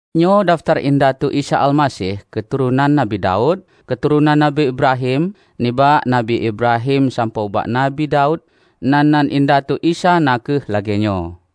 Nyoe dafeutar indatu Isa Almaseh, keuturonan Nabi Daud, keuturonan Nabi Ibrahim, nibak Nabi Ibrahim sampoe ubak Nabi Daud, nan-nan indatu Isa na kheueh lagée nyoe: